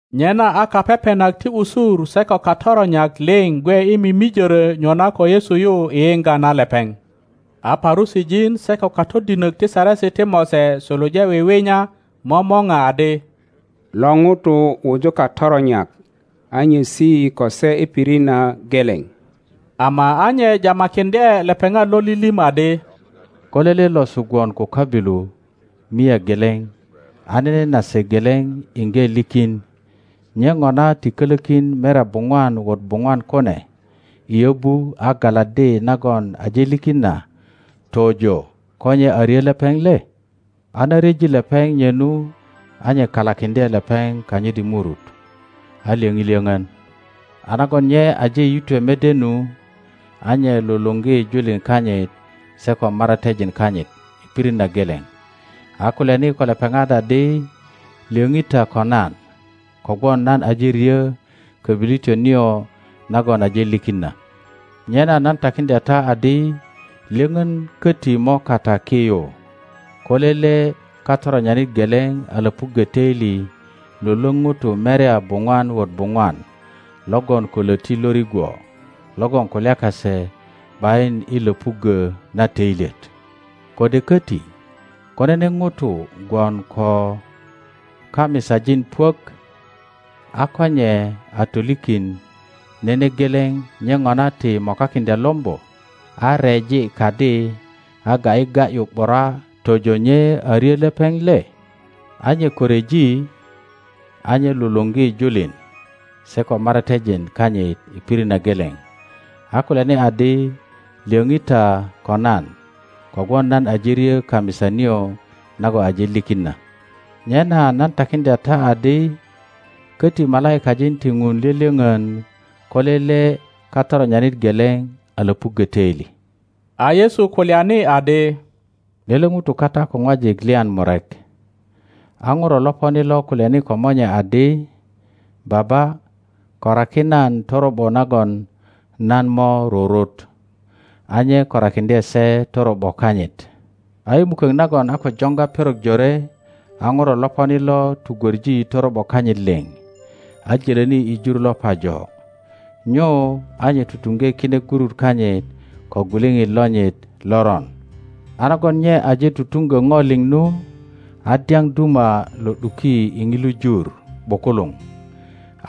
Nyena a kapepenak ti usur se ko katoronyak liŋ gwe i mimijorö nyona ko Yesu yu i yiŋga na lepeŋ. A Parusijin se ko katodinok ti Saresi ti Mose suluje wiwinya momora adi, Lo ŋuto wuju katoronyak a nyesi ko se i pirit na geleŋ. Ama a nye jamakiŋdye lepeŋat lo lilim adi, Ko lele losu gwon ko köbilu mia geleŋ a nene nase geleŋ iŋge likin, nye ŋona ti kolökin merya buŋwan wot buŋwan kune i yöbu a galaddi na nagon aje likin na tojo ko nye a ryö lepeŋ le? A na ryeji lepeŋ nye nu, a nye kalakiŋdye lepeŋ kanyit i murut, a lyoŋi lyoŋön; a nagon nye aje yitwe mede nu, a nye luluŋgi julin kanyit se ko maratejin kanyit i pirit na geleŋ, a kulyani ko lepeŋat adi, Lyöŋi ta ko nan, kogwon nan aje ryo kobilityo nio nagon aje likin na. Nyena nan takiŋdya ta adi, Lyöŋön köti mo kata ki yu ko lele katoronyanit geleŋ a lopuggö töili lwölwöŋ ŋutu merya buŋwan wot buŋwan logon ko loti lo rigwo logon kulya kase ’bayin i löpuggö na toilyet. Kode köti, ko nene ŋuto gwon ko kamisajin puök, a ko nye a tolikin nene geleŋ nye ŋona ti mokakiŋdya lombo, a reji kadi, a ga ’yi ga ’yu ’bura, tojo nye a ryö lepeŋ le? A nye ko ryeji, a nye luluŋgi julin se ko maratejin kanyit i pirit na geleŋ, a kulyani adi, Lyoŋi ta ko nan, kogwon nan aje ryö kamisa nio nagon aje likin na. Nyena nan takiŋdya ta adi, Koti malaikajin ti Ŋun lyölyoŋon ko lele katoronyanit geleŋ a löpuggö töili. A Yesu kulyani adi, Lele ŋuto kata ko ŋwajik lyan murek. A ŋuro loponi lo kulyani ko monye adi, Baba, koraki nan toro ’bo nagon nan mo rurut. A nye korakiŋdye se toro ’bo kanyit. A i mukok nagon a ko joŋga perok jore a ŋuro loponi lo tugwoŋi toro ’bo kanyit liŋ, a jölöni i jur lo pajo, nyu a nye tutuŋge kine gurut kanyit ko gwiliŋit lonyit loron. A nagon nye aje tutuŋgö ŋo liŋ nu, a dyaŋ duma lo ’duki i ŋilu jur ’bukuluŋ,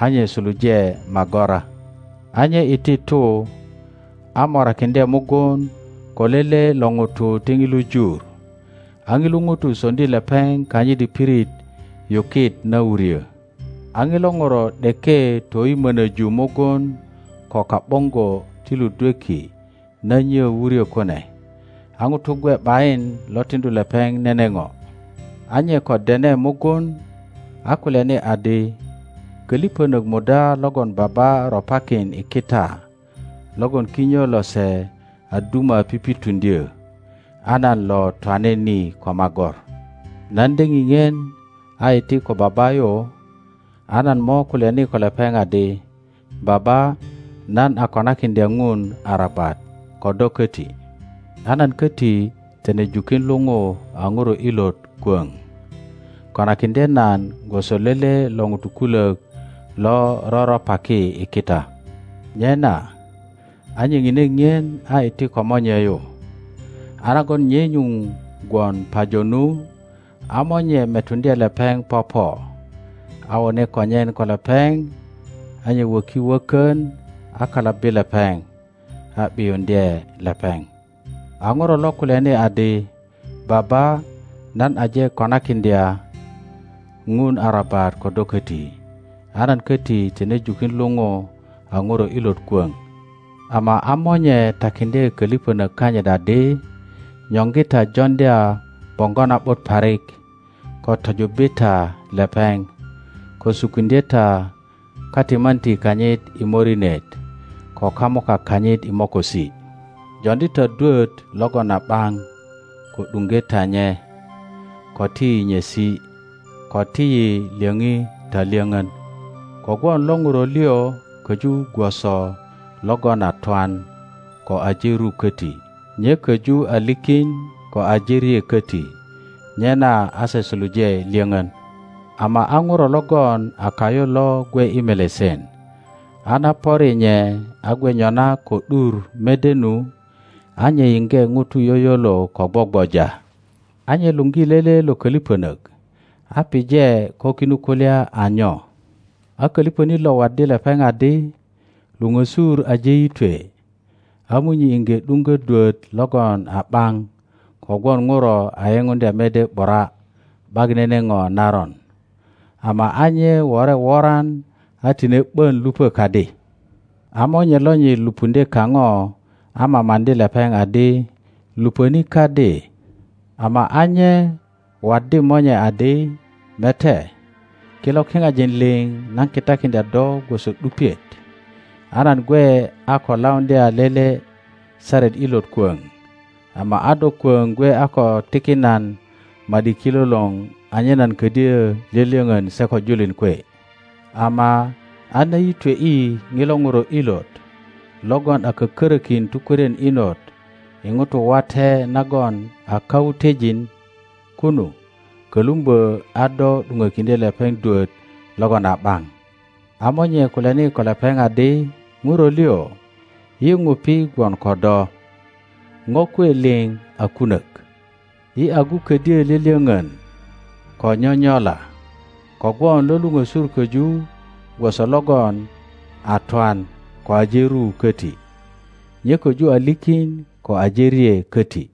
a nye suluje magora. A nye iti tu a morakiŋdye mugun ko lele lo ŋutu ti ŋilu jur, a ŋilu ŋuto soŋdi lepeŋ kanyit i pirit yukit na wuryö. A ŋilo ŋuro ’deke toyimönöju mugun ko ka ’boŋgo ti ludweki na nyö wuryo kune; a ŋuto gwe ’bayin lo tiŋdu lepeŋ nene ŋo. A nye ko dene mugun a kulyani adi, Köliŋönök muda logon baba ropakin i kita logon kinyo lose a duma pipituŋdyö, a nan lo twane ni ko magor? Nan de ŋiŋien a iti ko baba yu, a nan mo kulyani ko lepeŋ adi, Baba, nan a konakiŋdya Ŋun arabat ko do koti, a nan köti tine jukin luŋu a ŋuro ilot kwöŋ. Konakiŋdye nan gwoso lele lo ŋutu kulok lo roröpaki i kita. Nyena a nye ŋine ŋien a iti ko monye yu. A nagon nye nyuŋ gwon pajo nu, a monye metuŋdye lepeŋ popo, a wone konyen ko lepeŋ; a nye wöki wökön a kalabbi lepeŋ, a ’biuŋdye lepeŋ. A Ŋiörö lo kulyani adi, Baba, nan aje konakiŋdya Ŋun arabat ko do köti, a nan köti tine jukin luŋu a ŋuro ilot kwöŋ. Ama a monye takiŋdye köliŋönök kanyit adi, Nyoŋgi ta joŋdya boŋgo na ’but parik, ko tojubbi ta lepeŋ, ko sukiŋdye ta katimanti kanyit i morinet ko kamuka kanyit i mokosi. Joŋdi ta dwot logon a ’baŋ, ko ’duŋge ta nye, ko ti yi nyesi, ko ti yi lyöŋi ta lyöŋön, kogwon lo ŋuro liŋ köju gwoso logon a twan ko aje ru köti, nye köju a likin ko aje rye köti. Nyena a se suluje lyoŋön. Ama a ŋuro logon a kayu lo gwe i melesen, a na pöri nye a gwe nyona ko ’dur mede nu, a nye yiŋge ŋutu yoyolo ko gwogwoja. A nye luŋgi lele lo koliŋonok a pije ko kinu kulya a nyo. A köliŋönit lo waddi lepeŋ adi, Luŋösur aje yitwe, a munyi iŋge ’duŋgo dwöt logon a ’baŋ kogwon ŋuro a yepuŋdya mede ’bura ’bak nene ŋo naron. Ama a nye wore woran a tine ’bon lupö kadi. a monye lonyit lupuŋdye kaŋo a mamaŋdi lepeŋ adi, Luponi kadi. Ama a nye waddi monye adi, Mete, kilo kiŋajin liŋ nan kitakiŋdya do gwoso ’dupiet, a nan gwe a ko lauŋdya lele saret ilot kwoŋ; ama a do kwoŋ gwe a ko tikin nan ma ’di kilolor anyen nan kodyö lyolyöŋon se ko julin kwe. Ama a na yitwe ’i ŋilo ŋuro ilot, logon a kökörökin tukwörien inot i ŋutu wate nagon a kawutejin kunu, kölumbö a do ’duŋokiŋdye lepeŋ dwot logon a ’baŋ, A monye kulyani ko lepeŋ adi, Ŋuro liŋ, yi ŋupi gwon ko do. Ŋo kwe liŋ a kunök. Yi agu ködyo lyölyöŋön ko nyonyola, kogwon lo luŋösur koju gwoso logon a twan ko aje ru koti, nye köju a likin ko aje rye koti.